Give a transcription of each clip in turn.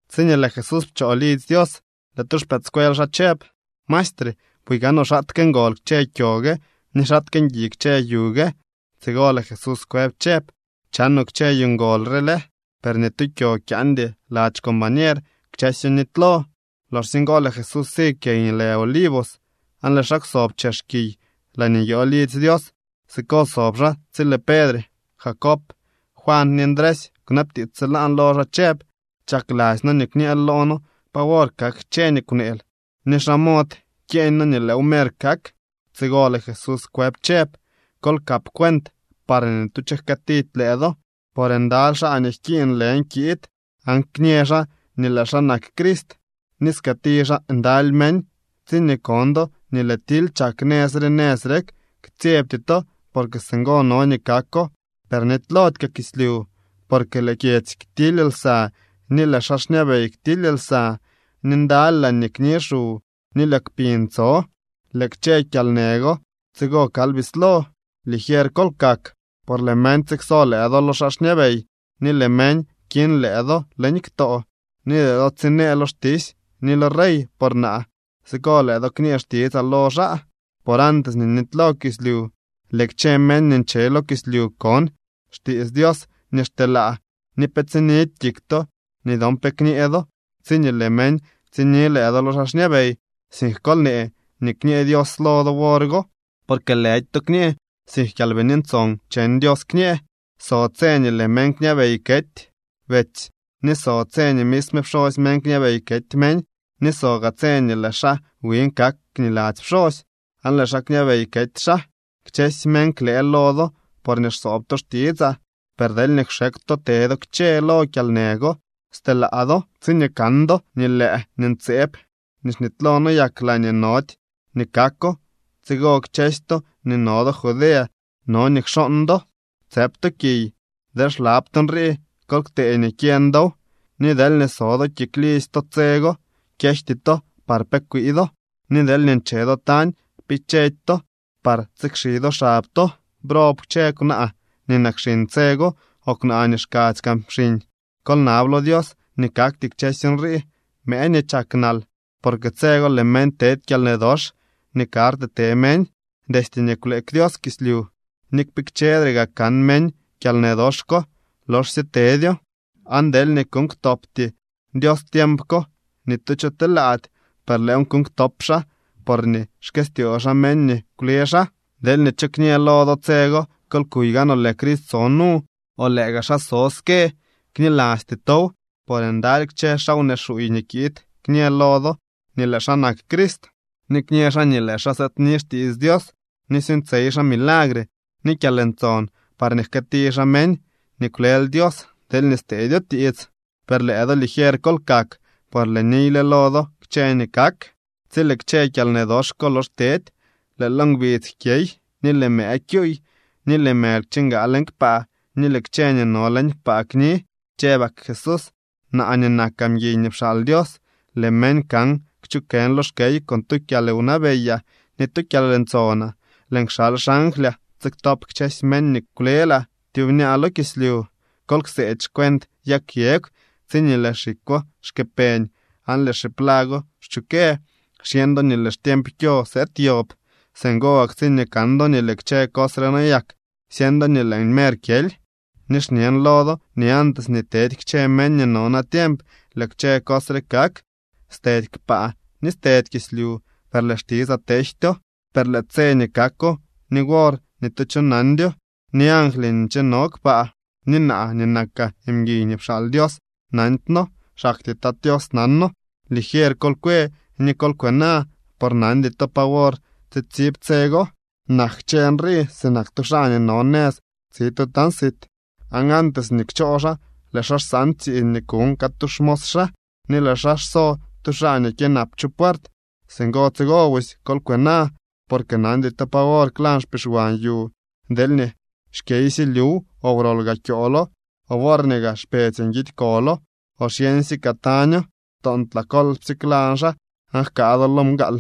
Tsiñee lëë Jesús pchoo lidzy Dios, lëë tu xpëëdscuel xaa chëb: —¡Maestre, buy gaanoo xaatke ngol kchë kyo gue ni xaatke ngui kchë yu gue! Tsigo lëë Jesús kwëb chëb: —¿Chanoo kchë yu ngol re lë? Per ni tu kyo kyaandy lady xcombañero. Kchësyo nitylo. Loxsye ngo lëë Jesús si kiy nii lë Olivos aan lëë xaa kwsob chex kiy laañee nyoo lidzy Dios. Siko sob xaa tsi lëë Pedre, Jacob, Juan ni Ndresy kwnabtiits tsilaan lo xaa chëb: —Chakladzy noo nii kñëël loo noo pa wor kak kchë nii kwneel. ¿Ni xa mod kyeeñ noo nii lëëw mer kak? Tsigo lëë Jesús kwëb chëb: —Kol kap cuent parñee ni tu cho jkëëtidy lëë do. Por ndaly xaa nii jkiiñ lën kiid aan kñë xaa nii lëë xaa nak Crist, ni skëëti xaa ndaly meñ. ’Tsiñee kon do nii lëë tily chak nëz re nëz rek, ktsyebty to, porque singo no nii kako. Per nitylody kaa kislyu. Porque lëë kyedzy ktily lsa ni lëë xaa xñabey ktily lsa. Ni ndaly laañee kni xu ni lëë kpiñ tso. Lëë kchë kyalnë go tsigo kal bislo. ’Ligier kol kak. Por lëë meñ tsikso lëë do lo xaa xñabey ni lëë meñ kiñ lëë do leñ ktoo. Ni lëë do tsinee lo xtisy ni lo rey por naa. Siko lëë do kñee xtitsaa lo xaa. Por antes nii nitylo kislyu, lëë kchë meñ nii nche lo kislyu kon xtiits Dios nii xteelaa. Ni pe tsinidy kik to nii dyon pe kñee do tsiñee lëë meñ tsini lëë do lo xaa xñabey, sink kol nee nii kñë Dios lo do wor go, porque lëdy to kñee, sink Kyalbini Ntson cheñ Dios kñee. So tse nii lëë meñ kñabey kety betsy ni so tse nii misme pxosy meñ kñabey kety meñ. Ni so gaa tse nii lëë xaa wiñ kak niladzy pxosy aan lëë xaa kñabey kety xaa. Kchësy meñ klëë lo do porñee xsoob to xtitsaa. Per deelñee kxekw to te do kchë lo kyalnë go, stelaa do. ’Tsiñee kan do nii lëë nii ntseeb nii xnitylo noyak laañee nody nii kako, tsigo kchësy to nii no do Judea no nii kxooñ do tsëp to kiy. (Deel xlab to nrii, kol ktee nii kyeñ dow.) Ni deelñee so do kik lidzy to tse go, kyejty to par pe kwii do. Ni deelñee nche do tañ, kpikchedy to par tsikxi do xab to. ¡Brob kchë kwnaa nii nak xiñ tse go o kwnaa nii xkadzy kaa xiñ! Kol nab lo Dios nii kakty kchësy nrii mëë nii chak nal. Porque tse go lëë meñ tedy kyalnë dox nii karty te meñ destye nii kwleek Dios kislyu, ni kpikchedre gaa kan meñ kyalnë dox ko loxsye tedyo. Aan deelñee kuuñ ktopty Dios tiemp ko, ni tu cho telaady. Per lëëw kuuñ ktop xaa porñee xkëstyoo xaa meñ nii kwle xaa. ’Deelñee cho kñë lo do tse go: “Kol kuy gaanoo, lëë Crist so nu”, o “Lëë gaa xaa so ske”, knilasty tow. Por ndaly kchë xaa wnee xuuy nii kiid kñë lo do nii lëë xaa nak Crist, ni kñë xaa nii lëë xaa sëëdni xtiits Dios, ni suuñtsyey xaa milagre ni kyalntson parñee jkëëti xaa meñ nii kwlel Dios deelñee steedyo tiits. Per lëë do ligier kol kak, por lëën niyle lo do kchë nii kak. ’Tsi lëë kchë kyalnë dox ko lox tedy, lëë lo ngbidz jkyey, ni lëë mëë kyuuy, ni lëë mëly kchingaa leñ kpaa ni lëë kchë nii no leñ kpaa kni. Chëbak Jesús: —Naa nii nakaa mguiy nii pxaal Dios, lëë meñ kan kchukën lo xkey con tu kyalwnabeyaa ni tu kyalntsonaa. Lëën kxal xanglyaa tsiktop kchësy meñ nii kwlelaa tyubñaa lo kislyu. ’Kol kseedy xcuent yag yegw: Tsiñee lëë xikwo xkë peñ, aan lëë xiplago xchukë, xyeñ do nii lëë xtiemp kyo sëëd yob. Singo gak tsiñee kan do nii lëë kchë cos re noyak, syeñ do nii lëën mer kyely. Ni xñen lo do nii antes nii tedy kchë meñ nii no natiemp lëë kchë cos re kak. Stedy kpaa ni stedy kislyu, per lëë xtitsaa tejtyo. ’Per lëë tse nii kako ni wor ni tu cho nandyo, ni angly nii ncheno kpaa. Ni naa nii nakaa mguiy nii pxaal Dios nandyno. Xaktyee Tat Tios nano. ’Ligier kol kwe ni kol kwena por nandy to pa wor tsitsib tse go. Nak kchë nrii sinak tu xaa nii no nëz tsi tu tañ sit, aan antes nii kchoo xaa lëë xaa xsaan tsiiñ nii kuñ catu xmos xaa, ni lëë xaa xso tu xaa nii kyënap chu puert. Singo tsigo busy, kol kwena, porque nandy to pa wor klañ xpixwan yu, deelñee xkyeysye lyuw, o wrol gaa kyoolo, o worñee gaa xpetsy nguidy kolo o xyeñsye kaa taño. Toontlaa kolpsye klañ xaa aan jkaa do lo mgaal.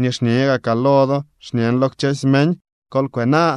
Nii xñe gakaa lo do xñen lo kchësy meñ: Kol kwena.